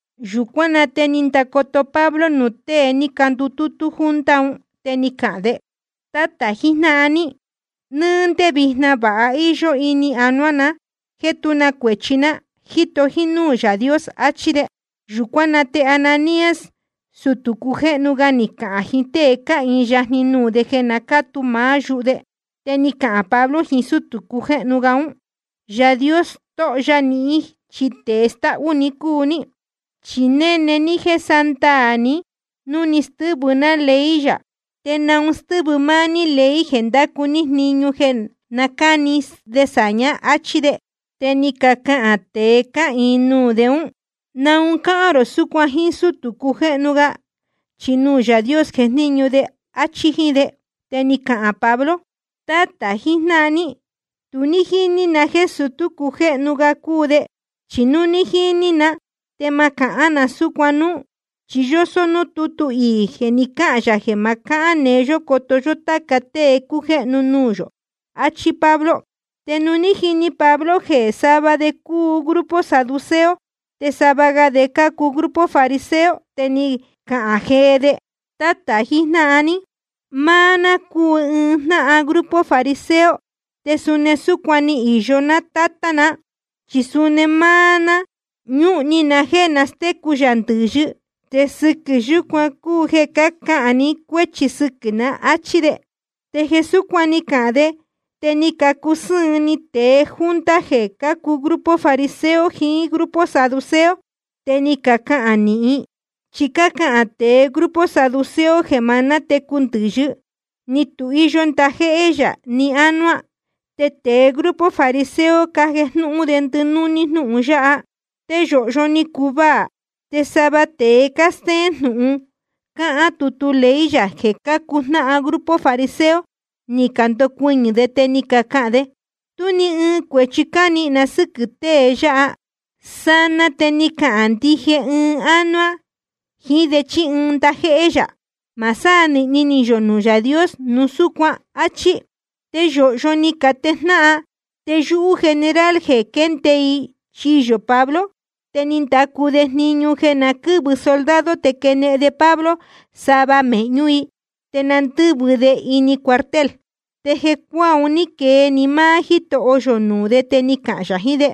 Yūcuán na te ni ndacoto Pablo nuū tée ni candutútú junta un, te ni cahān de: Tátā jijnáhan ní, nɨ́ɨ́ ndé vijna vāha íyó ni anuá na jéē tú na cuēchi ná, jíto jínúū Yaā Dios, áchí de. Yūcuán na te Ananías, sutū cujéhnu ga, ni cahān jiín tée cáhīin yajni nuū de jeē na cátu maá yuhu de. Te ni cahān Pablo jiín sútū cujéhnu ga ún: Yaā Dios stóho ya nihín chi tēe stáhú‑ni cúu ní, chi néne ní jéē sándaā ni núu ni stɨ́vɨ ná ley yā, ¿te naun stɨ́vɨ máá ní ley jeē ndácu ní jniñu jeē cáni de sāñá? áchí de. Te ni cacahān tēe cáhīin nuū de ún: ¿Naun cáhán rō súcuan jíín sútū cujéhnu ga? Chi nuū Yaā Dios jejníñu de, áchí jíín de. Te ni cahān Pablo: Tátā jijnáhan ní, tu ní jíní na jéē sutú cujéhnu ga cúu de, chi núu ní jíní na te ma cahán na súcuan núú, chi yósó núū tútu iī jeē ni cáhān yā jeē ma cahán neé yó coto yó táca tée cácujéhnu nuū yō, áchí Pablo. Te nuū ní jini Pablo jeē sava de cácuu grupo saduceo te sava ga de cácuu grupo fariseo, te ni cahān jee de: Tátā jijnáhan ní, máá ná cúu ɨɨn jnáhan grupo fariseo, te suni súcuan ni īyo tátá na. Chi suni máá ná ñúhun ni na jéē nastécu yā ndɨ̄yɨ, te sɨquɨ̄ yúcuan cúu jeē cácahān ni cuéchi sɨquɨ̄ ná, áchí de. Te jeē súcuan ni cahān de te ni cacusɨ́ɨn ni tēe junta jeē cácuu grupo fariseo jiín grupo saduceo, te ni cacahān nīhin. Chi cácahān tēe grupo saduceo jeē ma nátecu ndɨ̄yɨ, ni tu cáhīyo ndajéhé yā ni ánuá, te tēe grupo fariseo cájejnúhún de ndɨnúní jnúhun yáha. Te yōhyo ni cuvaā. Te sava tēe cástéén jnūhun cáhán tutu ley yā jeē cácuu jnáhan grupo fariseo, ni candocuɨñɨ̄ de, te ni cacahān de: Tú ni ɨɨn cuēchi cánihīn na sɨ́quɨ̄ tée yáha. Sanaa te ni cahān ndije ɨɨn ánuá jiín de chí ɨɨn ndajéhé yā. Ma sánīhni ni yō nuū Yaā Dios nuu súcuan, áchí. Te yōhyo ni catejnáhan, te yúhú general jeē quende i chiyō Pablo, te ni ndacu de jniñu jeē na quɨ́vɨ soldado te quenehen de Pablo sava mēhñú i, te na ndɨ́vɨ de ini cuartel. Te jecuáā un ní quee‑ni máá Jítoho yō nuū de, te ni cahān yā jiín de: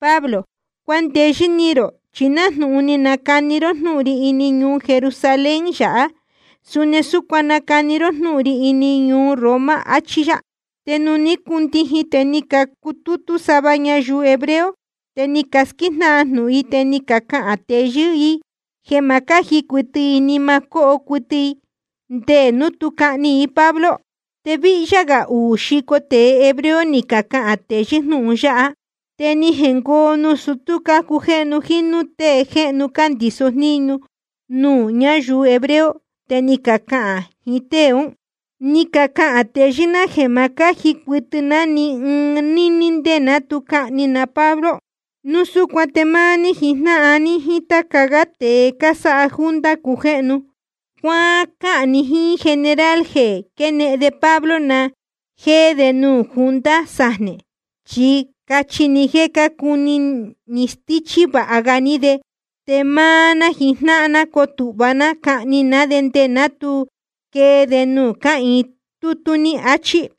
Pablo, cuandeyɨ́ ni rō, chi nájnūhun ni nacani ró jnúhun ri ini ñuu Jerusalén yāhá, suni súcuan nacani nahín ró jnūhun ri ini ñuu Roma, achí yá. Te nuū ní cundijin te ni cacutútú sava ñayuu hebreo, te ni casquíjnáhan jnūhun, te ni cacahān teyɨ́ i jeē ma cáji cuɨtɨ i ni ɨɨn ni ma cóho cuɨtɨ i nde núu tu cahni i Pablo. Te víhyá gā uū xico tēe hebreo ni cacahān teyɨ́ jnúhun yáha. Te ni jengoo nuū sutú cácujéhnu jíín núū tée jéhnu cándīso jníñu nuū ñáyuu hebreo, te ni cacahān jiín tée ún: Ni cacahān teyɨ́ ná jeē ma cáji cuɨtɨ ná ni ɨɨn níní nde ná tu cahni na Pablo. Núu súcuan te máá ní jijnáhan ní jíín táca gá tēe cásáha junta cujéhnu ga, cuácáhān ni jíín general jeē quenehen de Pablo na jéé de nuū junta sajnē, chi cachi ni jéē cácuni ni stíchí vāha ga ní de. Te máá ná jijnáhan ná cotūhva ná cahni ná de nde ná tu quee de nuū cáhīin tútú ní, achí.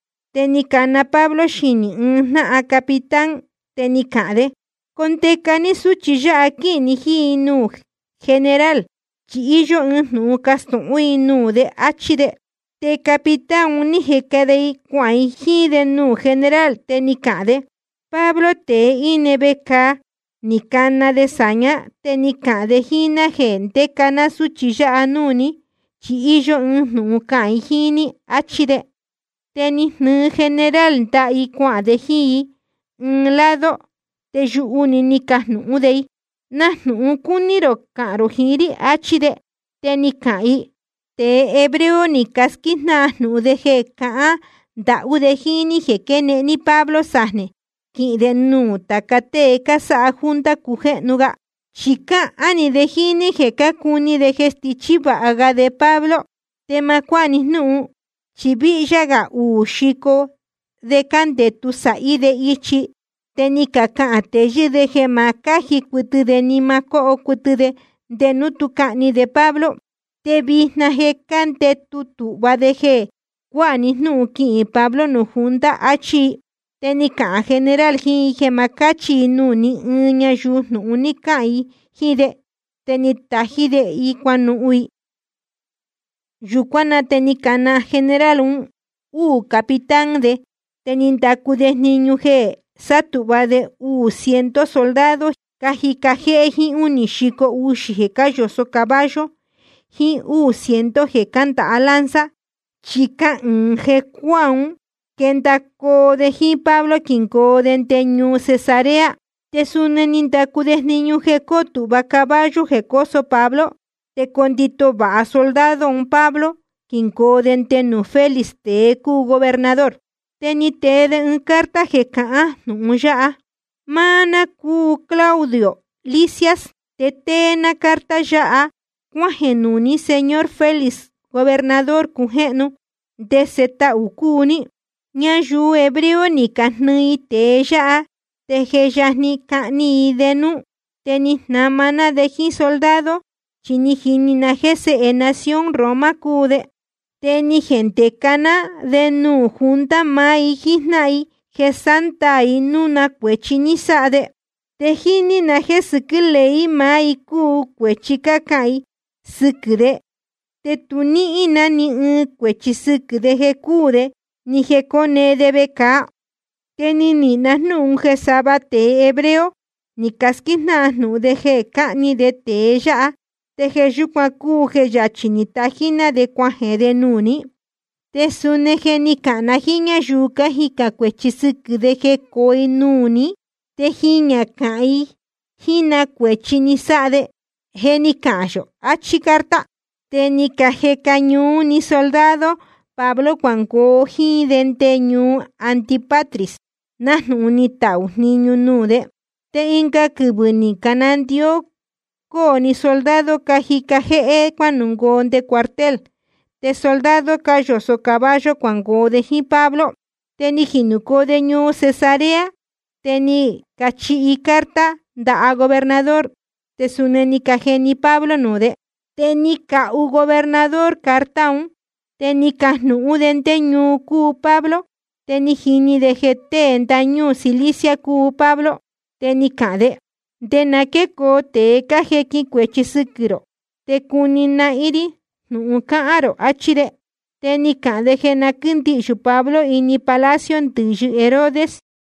Te ni cana Pablo xinī ɨɨn jnáhan capitán, te ni cahān de: Condeca ní súchi yáha quíhīn ni jíín i nuū general, chi íyó ɨɨn jnūhun castūhún i nuū de, áchí de. Te capitán un ní jeca de i cuahān i jíín de nuū general, te ni cahān de: Pablo, tēe íne vecāa, ni cana de sāñá, te ni cahān de jíín ná jeē quíndeca ná súchi yáha núū ní, chi íyó ɨɨn jnūhun cahān i jíín ní, áchí de. Te ni jnɨɨ general ndaha i cuahān de jíín i ɨɨn lado, te yuhu‑ni ni cajnūhún de i: Na jnūhun cúní rō cahān rō jiín rí, áchí de. Te ni cahān i: Tēe hebreo ni casquíjnáhan jnūhun de jeē cahān ndahú de jíín ní quenehen ní Pablo sajnē quihīn de nuū tāca tée cásáha junta cujéhnu ga, chi cahān‑ni de jíín ní jeē cácuni de jeē stichí vāha ga de Pablo. Te ma cuáha ni jnúhun, chi víhyá gā uū xico de cándētu sāhí de ichi, te ni cacahān teyɨ́ de jeē ma cáji cuɨtɨ de ni ɨɨn ni ma cóho cuɨtɨ de nde núu tú cahni de Pablo, te vijna je cándētu tūhva de jeē cuáha ni jnúhun quihīn Pablo nuū junta, áchí i. Te ni cahān general jiín i jeē ma cáchi i nuū ní ɨɨn ñayuu jeē ni cáhān i jnūhun yáha jíín de, te ni tají de i cuanuhun i. Yūcuán na te ni cana general uū capitán de, te ni ndacu de jniñu jeē sátūhva de uū ciento soldado cájica jéhé jíín únī xico uxī jeē cáyōsó caballo jiín úū ciento jeē cándāha lanza, chi cahɨɨ̄n jecuáā ún quendacoo de jíín Pablo quingoo de nde ñuu Cesarea. Te suni ni ndacu de jniñu jeē coo tūhva caballo jeē cóso Pablo, te condito vāha soldado un Pablo quingoo de nde nuū Félix, tēe cúu gobernador. Te ni tee de ɨɨn carta jeē cahán jnūhun yáha: Máá ná cúu Claudio Lisias, te tée ná carta yáha cuájeē nuū ní, señor Félix, gobernador cujéhnu. Ndese tahū cúu ní. Ñayuu hebreo ni cajnɨɨ i tēe yáha, te je yajni cahni i de núú, te ni jnama ná de jíín soldado, chi ni jini na jéē séhe nación Roma cúu de. Te ni jendeca ná de nuū junta maá i jíjnáhan i jeē sándaā i núu na cuēchi ni sáha de. Te ni jini na jéē sɨquɨ́ ley maá i cúu cuēchi cácahān i sɨquɨ̄ de, te tu níhín na ni ɨɨn cuēchi sɨquɨ̄ de jeē cúū de ni jeē cóne de vecāa. Te ni nihīn na jnúhun jeē sava tēe hebreo ni casquíjnáhan jnūhun de jeē cahni de tēe yáha, te jeē yúcuan cúu jeē yachī ni tají ná de cuajeē de nuū ní. Te suni je ni cahān na jíín ñáyuu cájicān cuēchi sɨquɨ̄ de jecoo i nuū ní, te jiñā cahān i jíín ní na cuēchi ni sáha de. Je ni cahān yō, achí carta. Te ni cajeca ñuú‑ni soldado Pablo cuangoo jíín de nde ñuu Antípatris, nájnūhun ni tahū jniñu nuū de. Te ɨnga quɨvɨ̄ ni canandió cóo‑ni soldado cájica jéhé cuánungoo nde cuartel, te soldado cáyōsó caballo cuangoo de jíín Pablo. Te ni jinūcoo ñuu Cesarea, te ni cachihi carta ndaha gobernador, te suni ni cajeni Pablo nuū de. Te ni cahu gobernador carta un. Te ni cajnūhún de ndé ñuu cúu Pablo, te ni jini de jeē tée ndañúū Cilicia cúu Pablo. Te ni cahān de: Nde na quécoo tēe cájequin cuēchi sɨquɨ̄ rō te cuni nahín rí jnūhun cahān rō, áchí de. Te ni cahān de jeē na quíndihyū Pablo ini palacio ndɨ̄yɨ Herodes.